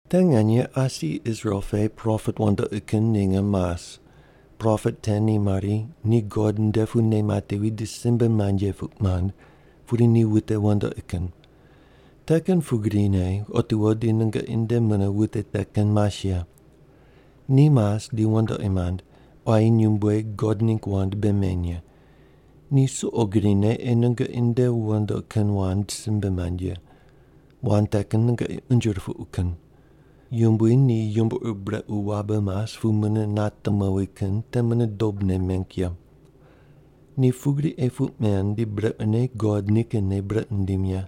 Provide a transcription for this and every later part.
Te nganye asi Israel pe propet wandoqi kin ninge mas. Propet te ni mari ni God nde pu nei matevi di simbe mand ye puq mand, pudi ni wute wandoqi kin. Te kin pugrine otiwo di nungoqi nde mune wute te kin mas ye. Ni mas di wandoqi mand, quayi nyumbueg God ningg wand bei meny ye. Ni suqo grine ei nungoqi nde wandoqi kin wand simbe mand ye. Wand te kin nungoqi unje rupuqu kin. Yumbui ni yumbo ur brequ wabe mas pu mune nate mowi kin te mune dobne meng ye. Ni pugri ei puq men, di brequne God nikinne brequ nindim ye.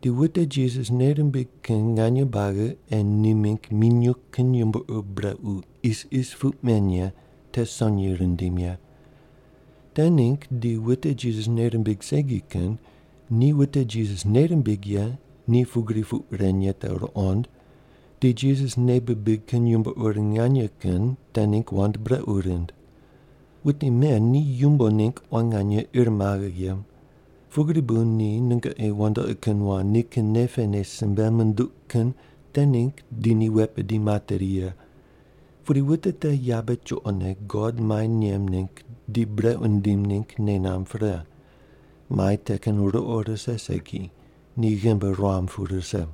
Di wute Jisas nei rimbig kin nganye buagi ei ni mingg minyuw kin yumbo ur brequ isis puq men ye te sonyi rindim ye. Te ningg di wute Jisas nei rimbig segi kin ni wute Jisas nei rimbig ye ni pugri puq ren ye te ruqond, di Jisas nei bibig kin yumbo ur nganye kin te ningg wand brequ rind. Wute men ni yumbo ningg quan nganye ir maghe ye. Pugri bu ni nungoqi wandoqi kin wand nikin nei pene simbe munduq kin te ningg di ni wet bidi materi ye. Pudi wute te yabe chuqone God mai nem ningg di brequ nindim ningg nei namb pre. Mai te kin ruqo rise segi, ni ghimbi ruam pu rise.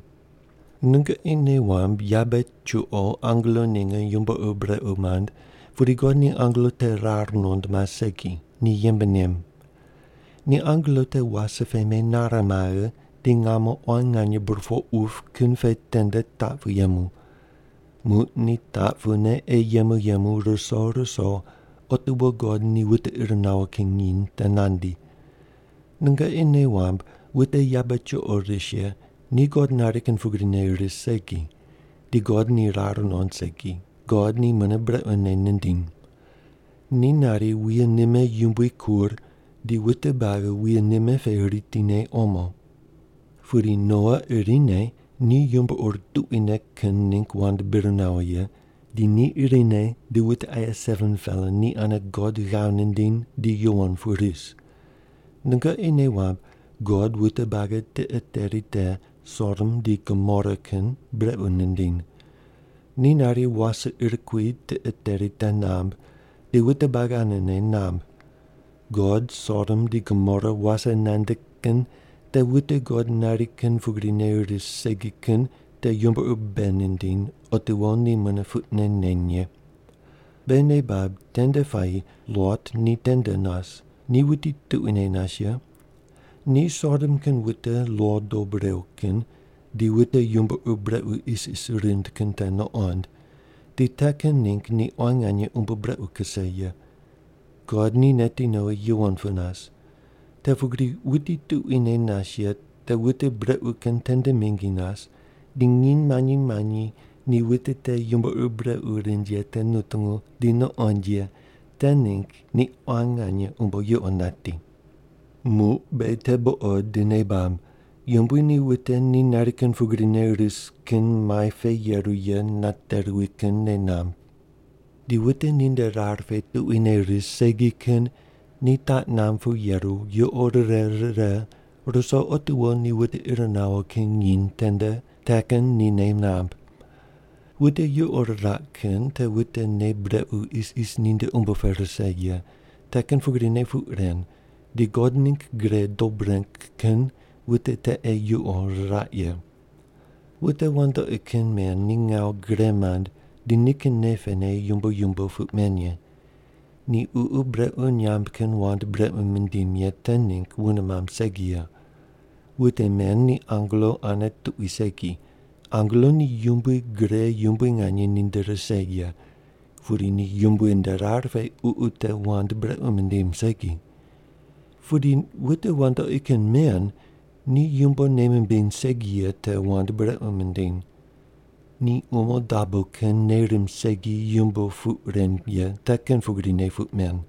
Nungoqi nei wamb yabe chuqo angelo ninge yumbo ur brequ mand, pudi God ni angelo te rar nuqond mas segi, ni yembe nem. Ni angelo te wase pe menare maghe, di ngamo quan nganye burpoq wup kin pe tende taq pu yemu. Muq ni taq pune ei yemu yemu ruso ruso otiwo God ni wute ir nawo kin nginy te nandi. Nungoqi nei wamb wute yabe chuqo ris ye ni God nari kin pugrine ris segi, di God ni rar nuqond segi, God ni mune brequne nindiny. Ni nari wuye nime yumbui kur di wute buagi wuye nime pe ritine omo. Pudi Noa irine ni yumbo ur tuquine kin ningg wand bir nawo ye, di ni irine di wute aye 7-pela ni ane God ghav nindiny di yuwon pu ris. Nungoqi nei wamb God wute buagi tiqe teri te Sodom di Gomora kin brequ nindiny. Ni nari wase ir kui tiqe teri te namb, di wute buagi anene namb. God Sodom di Gomora wase nande kin te wute God nari kin pugrine ris segi kin te yumbo ur bei nindiny otiwo ni mune puqne neny ye. Beghi nei bab tende puayi Lot ni tende nas, ni wuti tuquine nas ye. Ni Sodom kin wute lo dob rew kin di wute yumbo ur brequ isis rind kin te nuqond, di te kin ningg ni quan nganye umbo brequ kuse ye. God ni neti nowi yuwon pu nas. Te pugri wuti tuquine nas ye te wute brequ kin tende mingi nas, di nginy manyi manyi ni wute te yumbo ur brequ rind ye te nutungu di nuqond ye te ningg ni quan nganye umbo yuqo nati. Muq beghi te buqod di nei bab, Yumbui ni wute ni nari kin pugrine ris kin mai pe yeru ye nate ruwi kin nei namb. Di wute ninde rar pe tuquine ris segi kin ni taq namb pu yeru yuqo rire rire ruso otiwo ni wute ir nawo kin nginy tende te kin ni nei namb. Wute yuqo riraq kin te wute nei brequ isis ninde umbo pe rise ye te kin pugrine puq ren di God ningg gre dob reng kin wute te ei yuqo riraq ye. Wute wandoqi kin men ni ngawu gre mand di nikin nei pene yumbo yumbo puq men ye. Ni ququ brequ nyamb kin wand brequ mindim ye te ningg wune mamb segi ye. Wute men ni angelo ane tuqui segi, angelo ni yumbui gre yumbui nganye ninde rise ye, pudi ni Yumbui nde rar pe ququ te wand brequ mindim segi. Pudi wute wandoqi kin men ni yumbo nei mimbiny segi ye te wand brequ mindiny. Ni umo dabo kin nei rimb segi yumbo puq ren ye te kin pugrine puq men.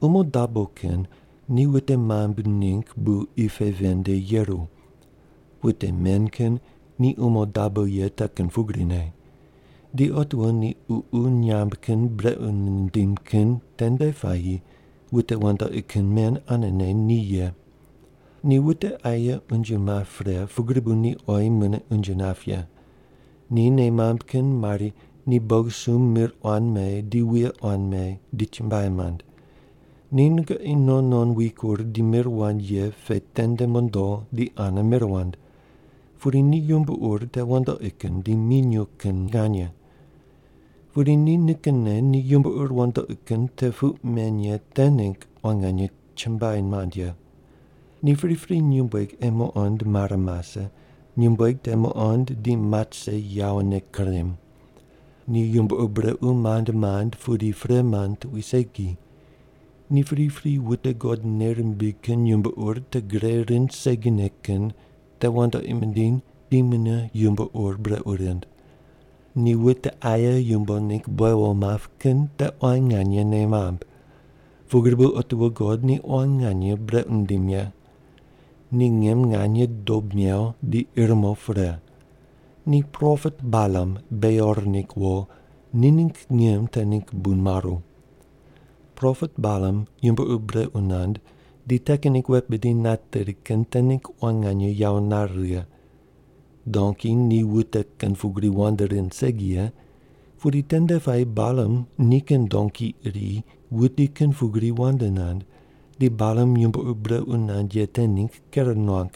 Umo dabo kin ni wute mambui ningg bu qi pe ven nde yeru. Wute men kin ni umo dabo ye te kin pugrine. Di otiwo ni ququ nyamb kin brequ nindim kin tende puayi wute wandoqi kin men anene ni ye. Ni wute aye unje map pre pugri bu ni oyi mune unje nap ye. Ni nei mamb kin mari ni bogisumb mir quan me di wuye quan me di chumbuai mand. Ni nungoqi non non wikur di mir wand ye pe tende mondo di ane mir wand, pudi ni yumbo ur te wandoqi kin di minyuw kin nganye. Pudi ni nikinne ni yumbo ur wandoqi kin te puq men ye te ningg quan nganye chumbuai mand ye. Ni pripri nyumbueg ei muqond mare mase, nyumbueg te muqond di mat rise yawone kurem. Ni yumbo ur brequ mand mand pudi pre mand tuqui segi. Ni pripri wute God nei rimbig kin yumbo ur te gre rind segine kin te wandoqi mindiny di ni mune yumbo ur brequ rind. Ni wute aye yumbo ningg buewo map kin te quan nganye nei mamb. Pugri bu otiwo God ni quan nganye brequ nindim ye. Ni ngim nganye dob mew di ir mo pre. Ni propet Balam, Beor ningg wo, ni ningg ngim te ningg bu maru. Propet Balam yumbo ur brequ nand di te kin ningg wet bidi nateri kin te ningg quan nganye yawo nare righe. Donki ni wute kin pugri wand rind segi ye, pudi tende puayi Balam nikin donki iri wuti kin pugri wand nand, di Balam yumbo ur brequ nand ye te ningg ker nuang.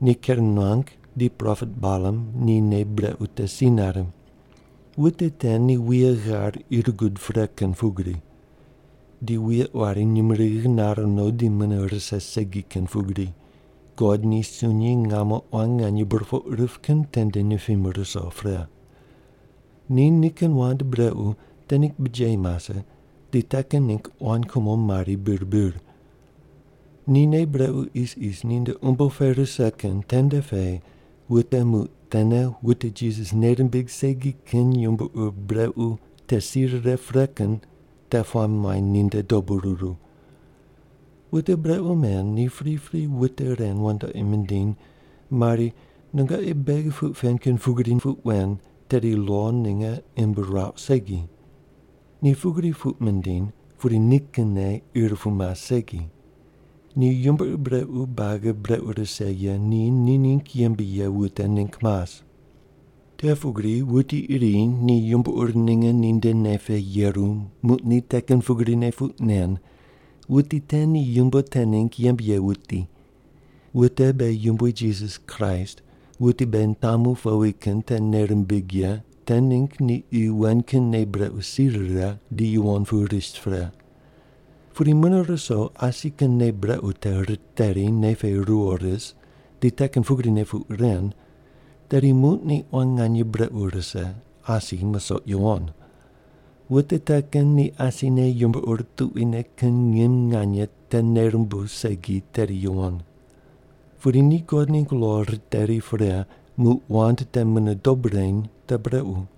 Ni ker nuang di propet Balam ni nei brequ te si nare. Wute te ni wuye ghar ir gud pre kin pugri. Di wuye quari nyumurighi nare no di mune rise segi kin pugri, God ni sunyi ngamo quan nganye burpoq rip kin tende nipim ruso pre. Ni nikin wand brequ te ningg bijeyi mase di te kin ningg quan kumo mari bir bir. Ni nei brequ isis ninde umbo pe rise kin tende pe wute muq tene wute Jisas nei rimbig segi kin yumbo ur brequ te si rire pre kin te puamb muany ninde dobu ruru. Wute brequ men ni pripri wute ren wandoqi mindiny mari, “Nungoqi beghi puq pen kin pugri puq wen, tedi lo ninge imb ruauq segi.” Ni pugri puq mindiny, pudi nikinne ir pu mas segi. Ni yumbo ur buagi brequ rise ye ni ni ningg yembe ye wute ningg mas. Te pugri wuti iri ni yumbo ur ninge ninde nei pe yeru muq ni te kin pugrine puq nen, wuti te ni yumbo te ningg yembe ye wuti. Wute beghi Yumbui Jisas Kraist wuti beghi nitamu powi kin te nei rimbig ye te ningg ni qi wen kin nei brequ si rire di yuwon pu ris pre. Pudi mune ruso asi kin nei brequ te riteri nei pe ruwo ris di te kin pugrine puq ren, tedi muq ni quan nganye brequ rise, asi musoq yuwon. Wute te kin ni asine yumbo ur tuquine kin ngim nganye te nei rumbuw segi tedi yuwon. Pudi ni God ningg lo riteri pre muq wand te mune dob reny te brequ.